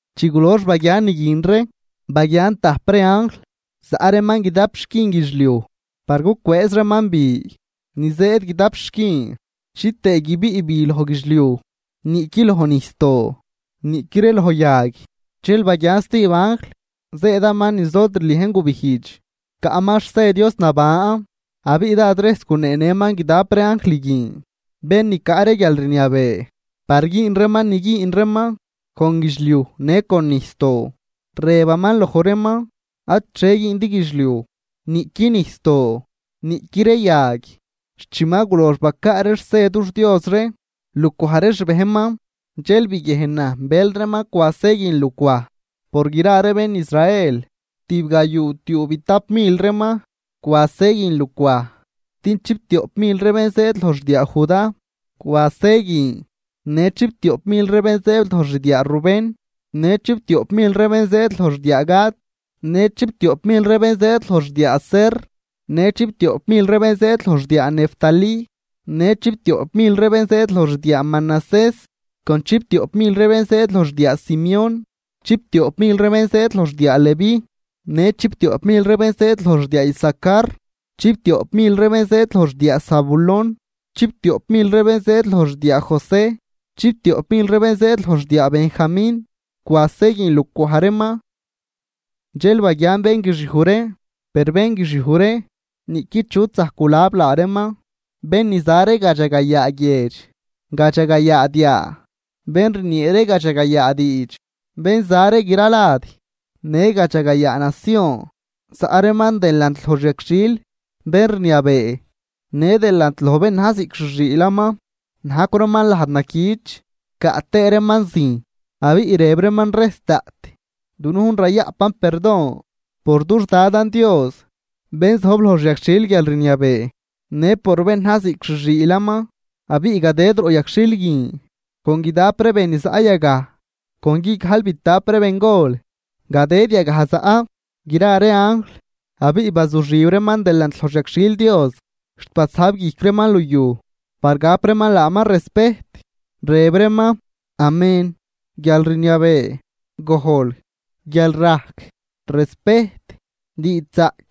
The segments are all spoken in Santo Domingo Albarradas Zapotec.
Chi gulox baguian ni guin ree, baguian tajp ree anjl zaꞌ reeman guidap xquin guidxliuj par gucwëëz reeman bi ni zëëd guidap xquin, chitëë guibiꞌ bi loj guidxliuj, niꞌqui loj nijsdoo, niꞌqui ree loj yag. Dxel baguian stijb anjl zëëdaman niz lod rliejn gubijdx, caꞌman xse Dios naban. Abiꞌ dád rejs guneenëman guidap ree anjl guin, bén ni caꞌ ree guialrniabee par güün reeman ni güün reeman con guidxliuj në con nijsdoo, rëbaman loj reeman: ―Ad xhie güündi guidxliuj, niꞌqui nijsdoo, niꞌqui ree yag, xt chi ma gulox bacaa ree xse dux Dios ree lucwaj ree xbejnman. Dxel biguiejnan bël reeman cwa se guin lucwaj. Por gra ree bén Israel, tibgayuutiuubitap mil reeman cwa se guin lucwaj. Din chiptioꞌp mil ree bén zëëd loj xdiaa Judá cwa se guin, në chiptioꞌp mil ree bén zëëd loj xdiaa Rubén në chiptioꞌp mil ree bén zëëd loj xdiaa Gad. Në chiptioꞌp mil ree bén zëëd loj xdiaa Aser, në chiptioꞌp mil ree bén zëëd loj xdiaa Neftalí, në chiptioꞌp mil ree bén zëëd loj xdiaa Manasés, con chiptioꞌp mil ree bén zëëd loj xdiaa Simeón, chiptioꞌp mil ree bén zëëd loj xdiaa Leví, në chiptioꞌp mil ree bén zëëd loj xdiaa Isacar, chiptioꞌp mil ree bén zëëd loj xdiaa Zabulón, chiptioꞌp mil ree bén zëëd loj xdiaa José, chiptioꞌp mil ree bén zëëd loj xdiaa Benjamín cwa se guin lucwaj reeman. Dxel baguian bénguixiuj ree, per bénguixiuj ree niꞌqui chut zajc gulab laa reeman, bén ni za ree gadxagayaa guiedx, gadxagayaa diaa, bén rniee ree gadxagayaa diidx bén za ree gra lad në gadxagayaa nacion. Zaꞌ reeman delant loj xyagxhil bénrniabee në delant loj bén na̱j ziꞌc xi xiilaman. Najcw reeman lajd naquich caꞌ tëë reeman zijn. Abiꞌ rëb reeman rejs daꞌt: Dunujn rayaꞌpan perdon por dux Dadan Dios bén zojb loj xyagxhil guialrniabee në por bén na̱j ziꞌc xi xiilaman. Abiꞌ gadëd roꞌ yagxhil guin con guidap ree be ni zaꞌ yagaj con guigajlbitap ree bengol, gadëd yagaj zaꞌ gra ree anjl abiꞌ bazuxib reeman delant loj xyagxhil Dios xt basajb guijc reeman liuj par gap reeman laaman respejt, rëb reeman: ¡Amén! guialrniabee, gojl, guialrajc, respejt, diidxzaꞌc,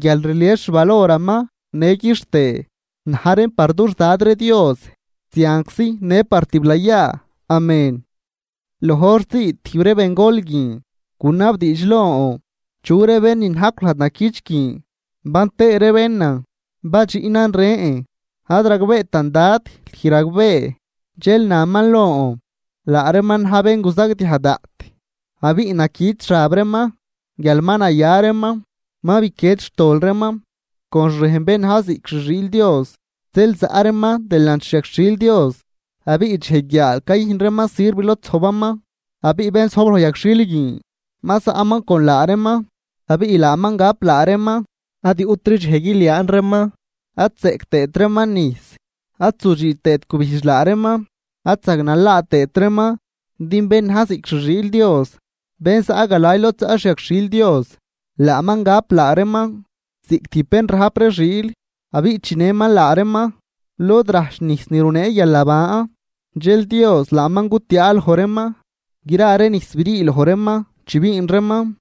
guialrlies xvaloraman në quixtëë, na̱j reen par dux Dad ree Dios zianczi në par tiblayaa. Amén. Loj hor zii tijb ree bengol guin gunabdiidx lon: ―¿Chu ree bén ni najcw lajd naquich guin, ban tëë ree bénan? Badxiꞌnan rën: ―Ad ragbeetan Dad, lüj ragbee. Dxel naman lon: ―Laa reeman na̱j bén guzagdiaj daꞌt abiꞌ naquich xab reeman guial ma naya reeman ma biquied xtol reeman con xrejn bén na̱j ziꞌc xi xiil Dios. Zeel zaꞌ reeman delant xi yagxhil Dios, abiꞌ dxej guiaal cayüjn reeman sirv lod zojbaman. Abiꞌ bén zojb loj yagxhil guin ma zaꞌman con laa reeman, abiꞌ laaman gap laa reeman. Ad yuꞌtri dxej guiliaan reeman, ad zeꞌc tëët reeman nijs, ad zudxüü tëët gubijdx laa reeman, ad zagnalaa tëët reeman. Din bén na̱j ziꞌc xi xiil Dios bén zaꞌ galay lod zaꞌ xi yagxhil Dios, laaman gap laa reeman ziꞌc tijb bén rajp ree xiil abiꞌ chinëman laa reeman lod rajch nijs ni runee guialnaban. Dxel Dios laaman gutiaa loj reeman gra ree nijs brii loj reeman chi biin reeman.